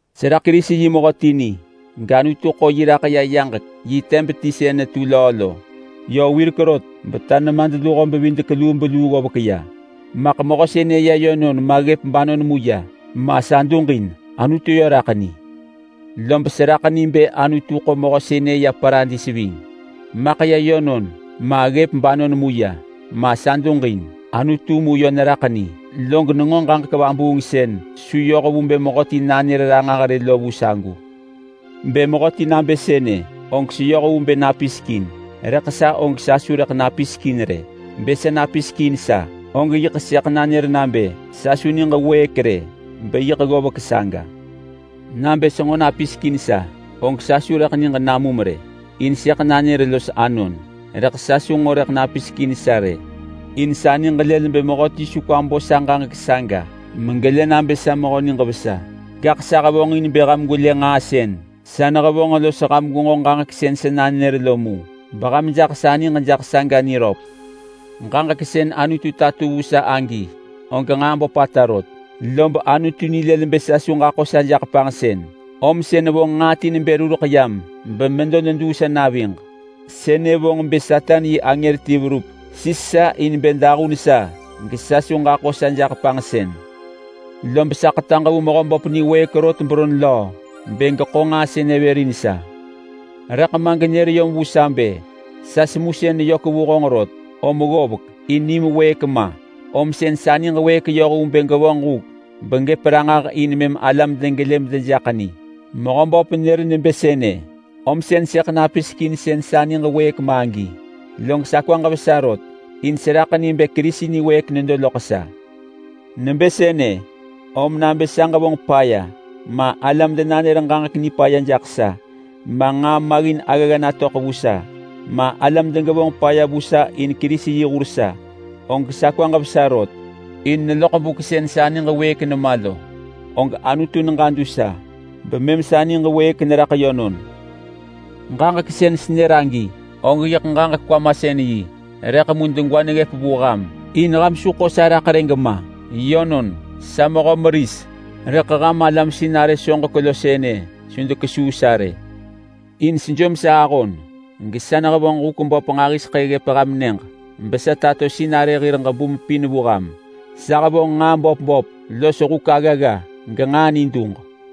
Seraḳ Kerisi yi mehöti ni, gAnutu ḳo yi raḳ ya yaġek yi teb ti sën netu löö lo. Yö wirek rot beta nemadluho bevidek lubeluu ggovek ya-maḳ mehö sënë ya yönon ma ggëp banon mu ya ma, sa duġin. Anutu yö raḳ ni. Log seraḳ ni bë Anutu ḳo mehö sënë ya Paradis ving-maḳ ya yönon, ma ggëp banon mu ya ma, sa duġin. Anutu mu yö neraḳ ni. Log nenġo ġaġek vabuung sën su yoh vu bë mehöti nanër ranġah rë lo vu sagu. Bë mehöti nabë sënë, og seyoh vu bë napisek in, rëḳ sa, og sa su rëḳ napisek in rë. Bë sa napisek in sa, og yiḳ sëḳ nanër nabë sa su niġ wëëk rë beyiḳ ggovek saga. Nabë senġo napisek in sa, og sa su rëḳ niġ namum rë, in sëḳ nanër los anon. Rëḳ sa su nġo rëḳ napisek in sa rë, in sa niġ lël bë mehöti su kwa bo sa ġaġek saga megelë nabë sa mehö niġ vesa. Gaḳ sa hevonġin bë ham gwelë nġaa sën sa nehevonġ los ham gwenġo ġaġek sën sa nanër lo mu, beham jaḳ sa niġ niröp jaḳ saga. Ġaġek sën Anutu tato vu sa agi, og nġaa böpata rot, lob Anutu nilël bë sa su ġaḳo sa jaḳ panġsën, om sën vonġ nġaa ti nebë rureḳ yam bemedo neduu sa naviġ. Sënë vonġ bë Satan yi angër ti verup sis sa in bë dahun sa gesa su ġaḳo sa jaḳ panġsën. Lob sa ḳetaġ vu Mehöböp niwëëk rot beron löö bë geḳo nġaa sënë vër in sa. Rëḳ ma genër yom vu sa bë, “Sa semusën neyök vu honġ rot om ggovek, in nim wëëk ma, om sën sa niġ wëëk yoh vu bë gevonġ huk begëp ranġah in mëm alam degelë medejaḳ ni.” Mehöböp nër nebë sënë, om sën sëḳ napisek in sën sa niġ wëëk ma agi. Lob sa kwaġ vesa rot in seraḳ ni bë Kerisi niwëëk nedo loḳ sa. Nebë sënë, om nabë sa ġevonġ paya, ma alam denanër ġaġek nipaya jaḳ sa, ma nġaa maggin aggagga natöḳ vu sa, ma alam degevonġ paya vu sa in Kerisi yi hur sa, og sa kwaġ vesa rot. In neloḳ buk sën sa niġ wëëk nema lo, og Anutu neġadu sa bemëm sa niġ wëëk neraḳ yönon. Ġaġek sën senër agi og yiḳ ġaġek-kwamasën-yi, rëḳ mu degwa neggëp vu ham in ham su ḳo sa raḳ rë gema. Yönon, sa mehö meris, rëḳ ham alam sinarë soġek sënë su dekesuu sa rë. In sejom sa ahon gesa nehevonġ huk böp nġahiseḳë ggëp ham nyëġ besa tato sinarë hir ġebum pin vu ham: Sa hevonġ nġaa böp böp los huk aggagga genġaa niduġ.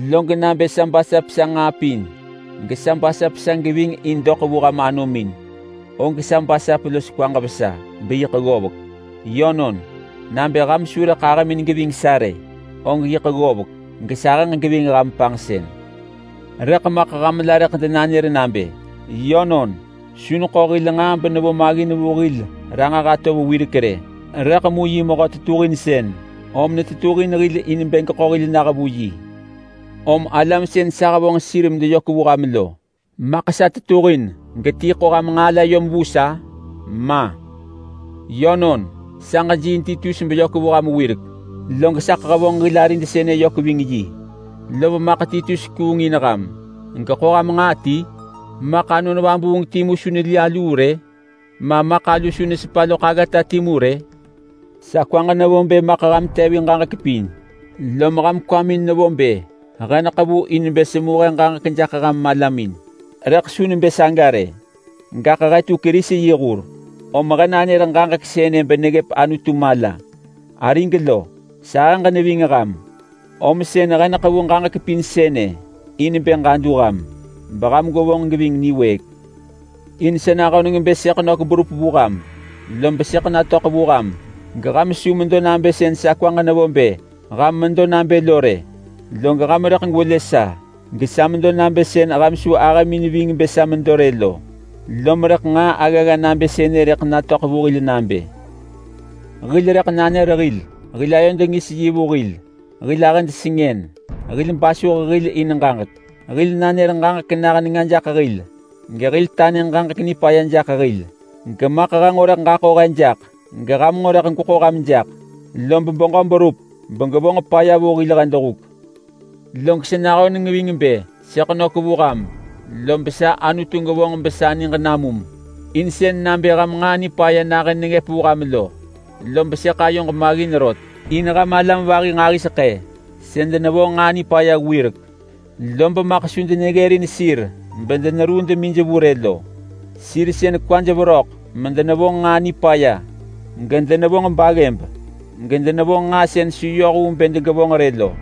Log nabë sa basap sa nġaa pin los sa geving in doḳ vu ham anomin, og sa basap los kwaġ vesa beyiḳ ggovek. Yönon, nabë ham su rëḳ ahëmin geving sa rë, og yiḳ ggovek gesahëġ geving ham panġsën. Rëḳ maḳ ham la rëḳ denanër nabë, “Yönon, su neḳo hil nġaa benevo maggin vu hil ranġah atov wirek rë, rëḳ mu yi mehö tetuhinsën, om netetuhin hil in bë geḳo hil nah vu yi.” Om alam sën sa hevonġ sir medeyök vu ham lo, maḳ sa tetuhin geti ḳo ham nġaa yom vu sa? Ma! Yönon, sa ġejiiin Titus beyök vu ham wirek, log saḳ hevonġ hil arid sënë yök ving yi. Lom maḳ Titus kuung in ham geḳo ham nġaa ti? Maḳ Anon Vabuung timu su neli aluu rë? Ma maḳ alu su nesepa loḳ aggata timu rë? Sa kwaġ nevo bë maḳ ham tevin ġaġek pin, lom ham kwamin nevo bë he neḳevu in bë semu he ġaġek jaḳ ham malamin. Rëḳ su nebë saga rë, gaḳ he tu Kerisi yi hur om he nanër ġaġek sënë beneggëp Anutu mala. Arig lo, sahëġ neving ham, om sën he neḳevu ġaġek pin sënë in bë ġadu ham beham gwevonġ geving niwëëk. In sa nahöneng bë sëḳ nök berup vu ham, lob sëḳ natöḳ vu ham geham su medo nabë sën sa kwaġ nevo bë ham medo nabë lo rë. Log ham rëḳ gwelë sa gesa medo nabë sën ham su ahëmin ving bë sa medo rë lo. Lom rëḳ nġaa aggagga nabë sënë rëḳ natöḳ vu hil nabë: Hil rëḳ nanër hil, hil ayod ngis yi vu hil, hil ahëd sengën, hil basuh hil in ġaġek, hil nanër ġaġek nah nenga jaḳ hil, gehil tanë ġaġek nipaya jaḳ hil. Gemaḳ he nġo rëḳ ġaḳo he jaḳ geham nġo rëḳ gweḳo ham jaḳ, lob beġö berup begevonġ paya vu hil huk. Log sa nahöneng ving bë sëḳ nök vu ham, lob sa Anutu gevonġ besa niġ namum in sën nabë ham nġaa nipaya nahën negëp vu ham lo. Lob sëḳ ayoġ maggin rot in ham alam vahi nġahiseḳë sën denevonġ nġaa nipaya wirek lob maḳ su deneggërin sir bedeneruu demij vu rë lo. Sir sën kwaj veröḳ medenevonġ nġaa nipaya, gedenevonġ baggëb, gedenevonġ nġaa sën su yoh vu bë degevonġ rë lo.